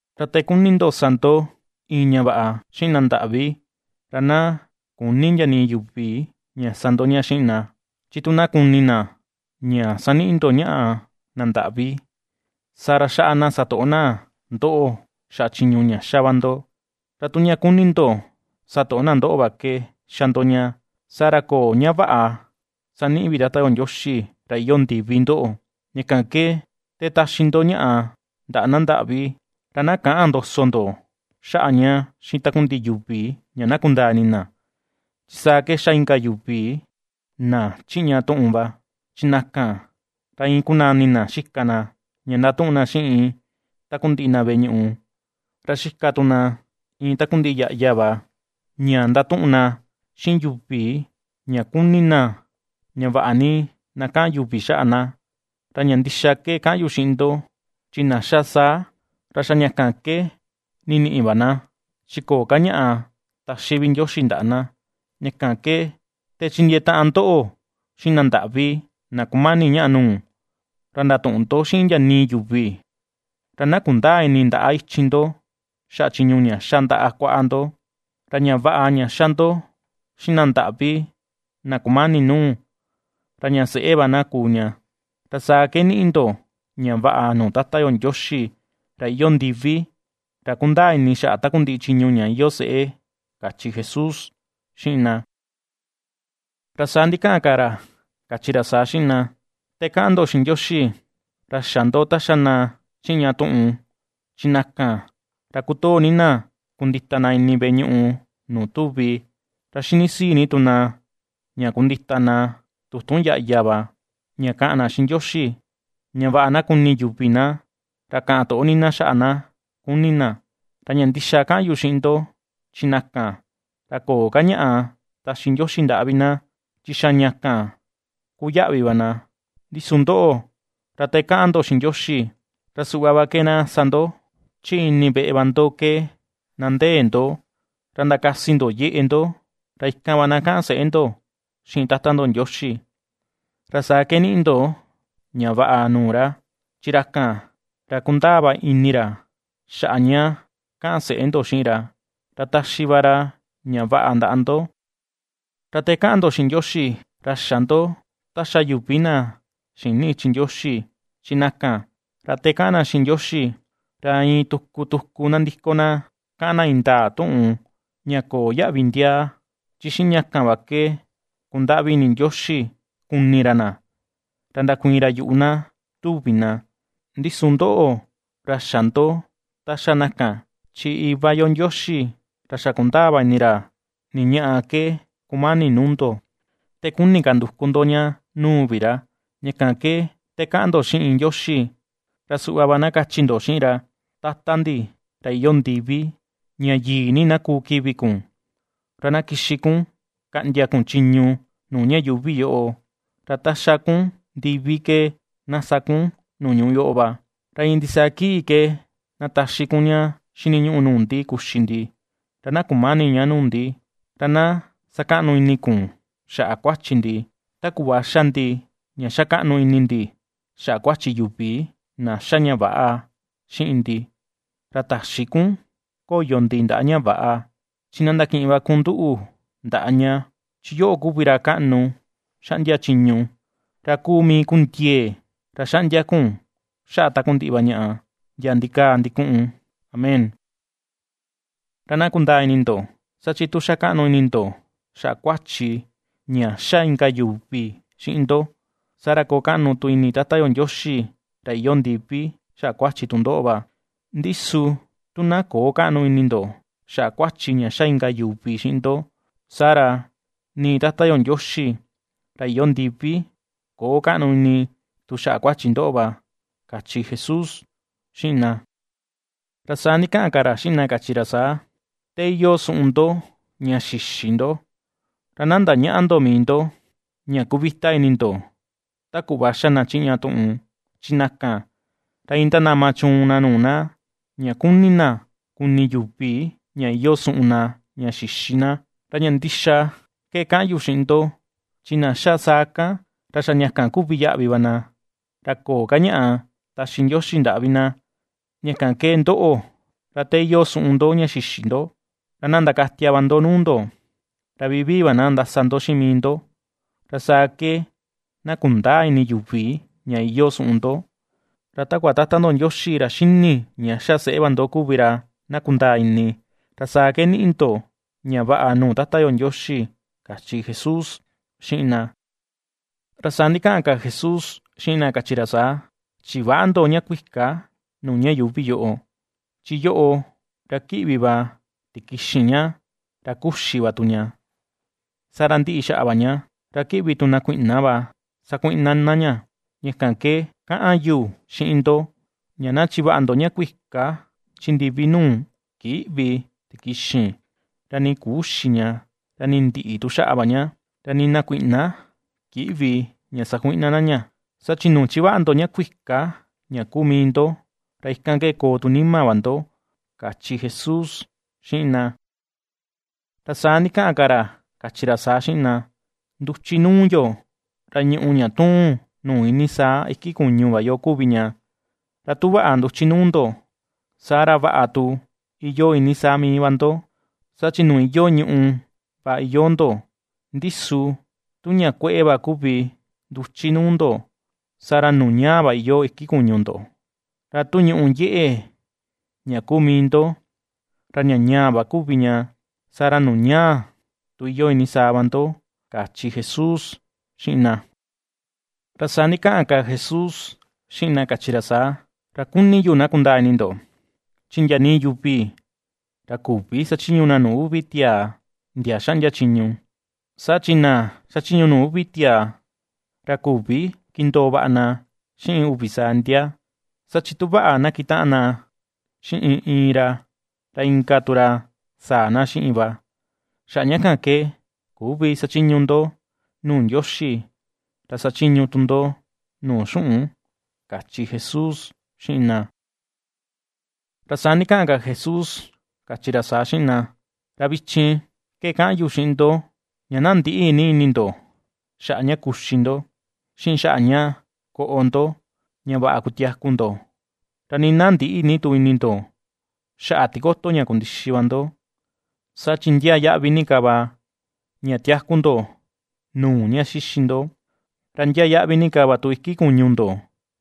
’Ra te kuni ndo sa ndo iin ña vaꞌa xiꞌin na ndaꞌvi, ra na küni ndia nii yuvi ña sa ndo ña xiꞌin na, chi tu na kuni na, ña saniꞌi ndo ñaꞌa na ndaꞌvi, saa ra xaꞌa na satoꞌo na ndoꞌo xaꞌa chiñu ña xa va ndo; ra tu ña kuni ndo satoꞌo na ndoꞌo va ke xa ndo ña, saa ra köo ña vaꞌa saniꞌi vi Tata yo Ndioxi ra iyoo ndivi ndoꞌo. Ña kan ke te taxi ndo ñaꞌa ndaꞌa na ndaꞌvi, ra na käꞌan ndoso ndo xaꞌa ña xiꞌin takundiꞌi yuvi ña na kundaa ini na, chi saa ke ^xa inka yuvi na chiꞌña tuꞌun va, chi na kan ra iin kunani na xika na ña ndatuꞌun na xiꞌin takundiꞌi na veꞌe ñuꞌu, ra xika tu na iin takundiꞌi yaꞌya va ña ndatuꞌun na xiꞌin yuvi, ña kuni na ña vaꞌa ni na kaꞌan yuvi xaꞌa na; ra ña ndixa ke kaꞌan yu xiꞌin ndo, chi na xa saa, ra xa ña kan ke niniꞌi va na, chi köo ka ñaꞌa taxi vi Ndioxi ndaꞌa na. Ña kan ke te chindiee taꞌan ndoꞌo xiꞌin na ndaꞌvi na kumani ñaꞌa nuu, ra ndatüꞌun ndo xiꞌin ndia nii yuvi, ra na kundäa ini ndaꞌa ichin ndo xaꞌa chiñu ña xa ndaꞌa kuaꞌa ndo. Ra ña vaꞌa ña xa ndo xiꞌin na ndaꞌvi na kumani nuu, ra ña seꞌe va na kuu ña, ra saa ke niꞌi ndo ña vaꞌa nuu Tata yo Ndioxi ra iyoo ndiví ra ^kundaa ini xaꞌa takundiꞌi chiñu ña iyoo seꞌe ―kachi Jesús xiꞌin na. Ra saa ndikaꞌan ka ra kachi ra saa xiꞌin na: ―Te kaꞌan ndo xiꞌin Ndioxi, ra xä ndo ta xa na chiꞌña tuꞌun, chi na kan ra kutoo ni na kundita na ini veꞌe ñuꞌu nuu tuvi, ra xini sii ni tu na ña kundita na tutun yaꞌya va ña kaꞌan na xiꞌin Ndioxi, ña vaꞌa na kuni yuvi na, ra kaꞌan toꞌo ni na xaꞌa na kuni na. Ra ña ndixa kaꞌan yu xiꞌin ndo, chi na kan, ra köo ka ñaꞌa taxi Ndioxi ndaꞌa vi na, chi xa ña kan ku yaꞌvi va na. Ndi su ndoꞌo, ra te kaꞌan ndo xiꞌin Ndioxi ra suꞌva va ke na sa ndo: chi ini veꞌe va ndo ke na ndee ndo; ra ndakasi ndo yeꞌe ndo, ra ikan va na kaꞌan seꞌe ndo xiꞌin Tata ndo Ndioxi, ra saa ke niꞌi ndo ña vaꞌa nuu ra, chi ra kan, ra kundaa va ini ra xaꞌa ña kaꞌan seꞌe ndo xiꞌin ra, ra taxi va ra ña vaꞌa ndaꞌa ndo. ’Ra te kaꞌan ndo xiꞌin Ndioxi, ra xä ndo ta xa yuvi na xïni ichi Ndioxi, chi na kan ra te kaꞌan na xiꞌin Ndioxi, ra iin tuku, tuku nandiko na kaꞌan na indaa tuꞌun ña köo yaꞌvi ndiaa, chi xiꞌin ña kan va ke kundaꞌvi ini Ndioxi kuni ra na, ra ndakuiin ra yuꞌu na, tuvi na. Ndi su ndoꞌo, ra xä ndo ta xa na kan, chi Iva yo Ndioxi ra xa kundaa va ini ra ni ñaꞌa ke kumani nuu ndo, te kuni ka nduku ndo ña nuu vi ra. Ña kan ke te kaꞌan ndoꞌo xiꞌin Ndioxi ra suꞌva va na kachi ndo xiꞌin ra: Tata ndi, ra iyoo ndiví, ña yii ni na kuu kivi kun. Ra na kixi kun kaꞌndia kun chiñu nuu ña yuuvi yoꞌo. Ra ta xa kun ndivi ke, na sa kun nuu ñuꞌu yoꞌo va. Ra iin ndisaa kii ke ná taxi kun ña xiniñuꞌu nuu ndi kuxi ndi; ra na kumäni ña nuu ndi. Ra na sakaꞌnu ini kun xaꞌa kuáchi ndi, Ta kuꞌva xa ndi ña ^xakaꞌnu ini ndi xaꞌa kuachi yuvi, na xa ña väꞌa xiꞌin ndi. Ra täxi kun koyo ndi ndaꞌa ña väꞌa; Chi na ndakiꞌin va kun nduꞌu ndaꞌa ña. Chi yoꞌo kuvi ra kaꞌnu xaꞌndia chiñu, ra kuu mii kun ndiee, ra xaꞌndia kun xaꞌa takundiꞌi va ñaꞌa, ndia ndikaa ndikuꞌun. Amén. ’Ra na kundaa ini ndo, saa chi tu xakaꞌnu ini ndo xaꞌa kuachi ña xa inka yuvi xiꞌin ndo, saa ra koo kaꞌnu tu ini Tata yo Ndioxi ra iyoo ndivi xaꞌa kuachi tu ndoꞌo va. Ndi su tu na köo kaꞌnu ini ndo xaꞌa kuachi ña xa inka yuvi xiꞌin ndo, saa ra nii Tata yo Ndioxi ra iyoo ndivi köo kaꞌnu ini tu xaꞌa kuachi ndoꞌo va ―kachi Jesús xiꞌin na. Ra saa ndikaꞌan ka ra xiꞌin na kachi ra saa: ―Te iyoo suꞌun ndo ña xïxi ndo, ra na ndañäꞌa ndo mii ndo ña kuvita ini ndo ta kuꞌva xa na chiꞌña tuꞌun, chi na kan, ra iin ndanama chuun na nuu na, ña kuni na kuni yuvi ña iyoo suꞌun na ña xïxi na. Ra ña ndixa ke kaꞌan yu xiꞌin ndo, chi na xa saa kan, ra xa ña kan kuvi yaꞌvi va na, ra köo ka ñaꞌa taxi Ndioxi ndaꞌa vi na. Ña kan ke ndoꞌo, ra te iyoo suꞌun ndo ña xïxi ndo, ra na ndakatia va ndo nuu ndo, ra vivii va na ndasa ndo xiꞌin mii ndo. Ra saa ke na kundäa ini yuvi ña iyoo suꞌun ndo, ra takua Tata ndo Ndioxi ra xini ña xa seꞌe va ndo kuvi ra na kundaa ini, ra saa ke niꞌi ndo ña vaꞌa nuu Tata yo Ndioxi ―kachi Jesús xiꞌin na. Ra saa ndikaꞌan ka Jesús xiꞌin na, kachi ra saa: ―Chiväꞌa ndo ña kuika nuu ña yuuvi yoꞌo, chi yoꞌo ra ^kíꞌvi va tikixin ña, ra kuxi va tu ña, saa ra ndiꞌi xaꞌa va ña, ra ^kíꞌvi tu na kuiꞌna va sakuiꞌna na ña. Ña kan ke kaꞌan yu xiꞌin ndo, ña na chivaꞌa ndo ña kuika chi ndivi nuu ^kïꞌvi tikixin, ra nii küxi ña, ra nii ndïꞌi tu xaꞌa va ña, ra nii na kuiꞌna kïꞌvi ña sakuiꞌna na ña. Saa chi nuu ^chivaꞌa ndo ña kuika ña kuu mii ndo, ra ikan ke koo tu nima va ndo ―kachi Jesús xiꞌin na. Ra saa ndikaꞌan ka ra kachi ra saa xiꞌin na: ―Nduchi nuu yo, ra ñùꞌù ña ^tuun nuu iinii saa iki kuñu va yo kuvi ña; ra tu vaꞌa nduchi nuu ndo, saa ra vaꞌa tu iyoo iinii saa mii va ndo, saa chi nuu iyoo ñuꞌu va iyoo ndo. Ndi su tu ña kueꞌe va kuvi nduchi nuu ndo, saa ra nuu ñaa va iyoo iki kuñu ndo, ra tu ñùꞌù yeꞌe ña kuu mii ndo ra ña ñaa va kuvi ña, saa ra nuu ñaa tu iyoo iinii saa va ndo ―kachi Jesús xiꞌin na. Ra saa ndikaꞌan ka Jesús xiꞌin na kachi ra saa: ―Ra kuni yu na kundaa ini ndo, chi ndia nii yuvi ra küvi sachiñu na nuu uvi tiaa ndia xaꞌndia chiñu, saa chi na xachiñu nuu uvi tiaa, ra küvi kindoo vaꞌa na xiꞌin uvi saa ndia. Saa chi tu vaꞌa na kitaꞌan na xiꞌin iin ra, ra inka tu ra sáa̱ na xiꞌin va. Xaꞌa ña kan ke küvi sachiñu ndo nuu Ndioxi ra sachiñu tu ndo nuu xuꞌun ―kachi Jesús xiꞌin na. Ra saa ndikaꞌan ka Jesús kachi ra saa xiꞌin na: ―Ra vichin ke kaꞌan yu xiꞌin ndo, ña na ndïꞌi ni ini ndo xaꞌa ña kuxi ndo, xiꞌin xaꞌa ña koꞌo ndo, ña vaꞌa kutiaku ndo, ra nii na ndïꞌi ni tu ini ndo xaꞌa tikoto ña kundixi va ndo; saa chi ndiaa yaꞌvi ni ka va ña tiaku ndo nuu ña xíxi ndo, ra ndiaa yaꞌvi ni ka va tu iki kuñu ndo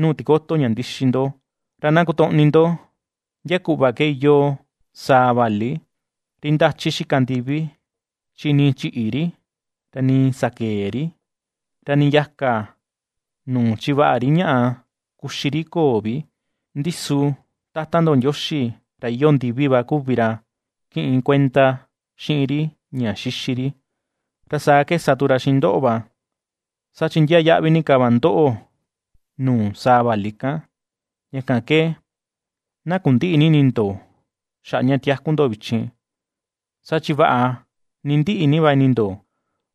nuu tikoto ña ndixi ndo. Ra na kutoꞌni ndo ndia kuꞌva ke iyoo saa vali, ri ndachi xika ndivi, chi nii chïꞌi ri, ra nii sakëe ri, ra nii yaka nuu chivaꞌa ri ñaꞌa kuxi ri köo vi, ndi su Tata ndo Ndioxi ra iyoo ndivi va kuvi ra kiꞌin kuenda xiꞌin ri ña xixi ri. Ra saa ke sa tu ra xiꞌin ndoꞌo va, saa chi ndiaa yaꞌvi ni ka va ndoꞌo nuu saa vali kan. Ña kan ke na kundïꞌi ni ini ndo xaꞌa ña tiaku ndo vichin, saa chi vaꞌa ni ndiꞌi ni va ini ndo,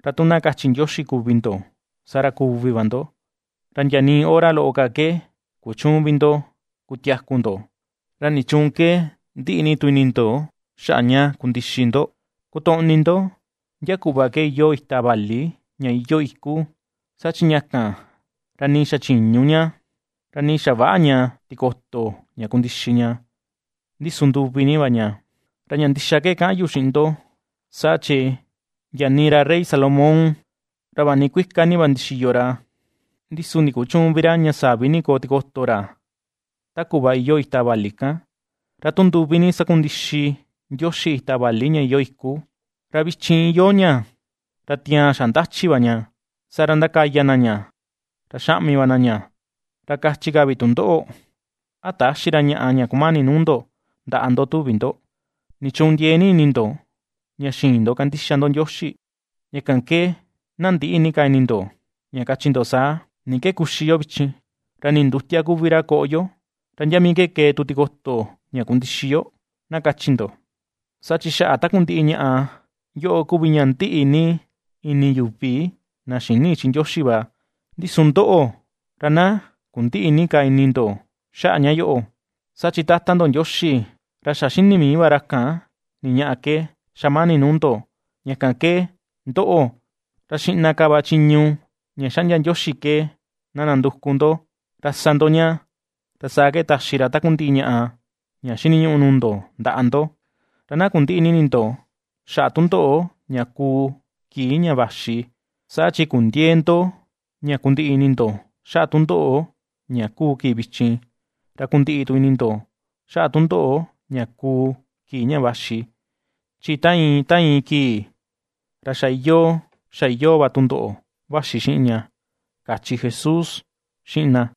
ra tu na kachi Ndioxi kuvi ndo, saa ra kuvi va ndo, ra ndia nii hora loꞌo ka ke kuchüun vi ndo kutiaku ndo. ¿Ra nichuun ke ndiꞌi ni tu ini ndo xaꞌa ña kundixi ndo? Kutoꞌni ndo ndia kuꞌva ke iyoo ita vali ña iyoo iku, saa chi ña kan ra nii xachïñu ña, ra nii xaväꞌa ña tikoto ña kundixa ña, ndi su nduvi ni va ña. Ra ña ndixa ke kaꞌan yu xiꞌin ndo, saa chi ndia nii ra rey Salomón ra vaꞌa ni kuika ni va ndixiyo ra, ndi su ndikuchüun vi ra ña sa̱ví ni koo tikoto ra ta kuꞌva iyoo ita vali kan. Ra tu nduvi ni sakundixi Ndioxi ita vali ña iyoo iku, ra vichin iyoo ña, ra tiaan xa ndachi va ña, saa ra ndakaya na ña ra xaꞌmi va na ña, ra kachi ka vi tu ndoꞌo, ¿a täxi ra ñaꞌa ña kumani nuu ndo ndaꞌa ndo tuvi ndo? ¿Nichuun ndiee ni ini ndo ña xïin ndo kandixa ndo Ndioxi? Ña kan ke na ndïꞌi ni ka ini ndo ña kachi ndo saa: “¿Ni ke kuxi yo vichin, ra ni ndutia kuvi ra koꞌo yo, ra ndia mii kee tu tikoto ña kundixi yo?”, na kachi ndo. Saa chi xaꞌa takundiꞌi ñaꞌa yoꞌo kuvi ña ndiꞌi ni ini yuvi na xïni ichi Ndioxi va. Ndi su ndoꞌo, ra na kundïꞌi ni ka ini ndo xaꞌa ña yoꞌo, saa chi Tata ndo Ndioxi ra xa xini mii va ra kan ni ñaꞌa ke xamani nuu ndo. Ña kan ke, ndoꞌo, ra xiꞌna ka va chiñu ña xaꞌndia Ndioxi ke ná ndanduku ndo, ra sa ndo ña, ra saa ke taxi ra takundiꞌi ñaꞌa ña xíniñuꞌu nuu ndo ndaꞌa ndo. Ra na kundïꞌi ni ini ndo xaꞌa tundoꞌo ña kuu kii ña vaxi, saa chi kundiëe ndo ña kundiꞌi ini ndo xaꞌa tundoꞌo ña ^kuu kii vichin, ra kundiꞌi tu ini ndo xaꞌa tundoꞌo ña kuu kii ña vaxi. Chi ta iin, ta iin kii, ra xa iyoo, xa iyoo va tundoꞌo vaxi xiꞌin ña ―kachi Jesús xiꞌin na.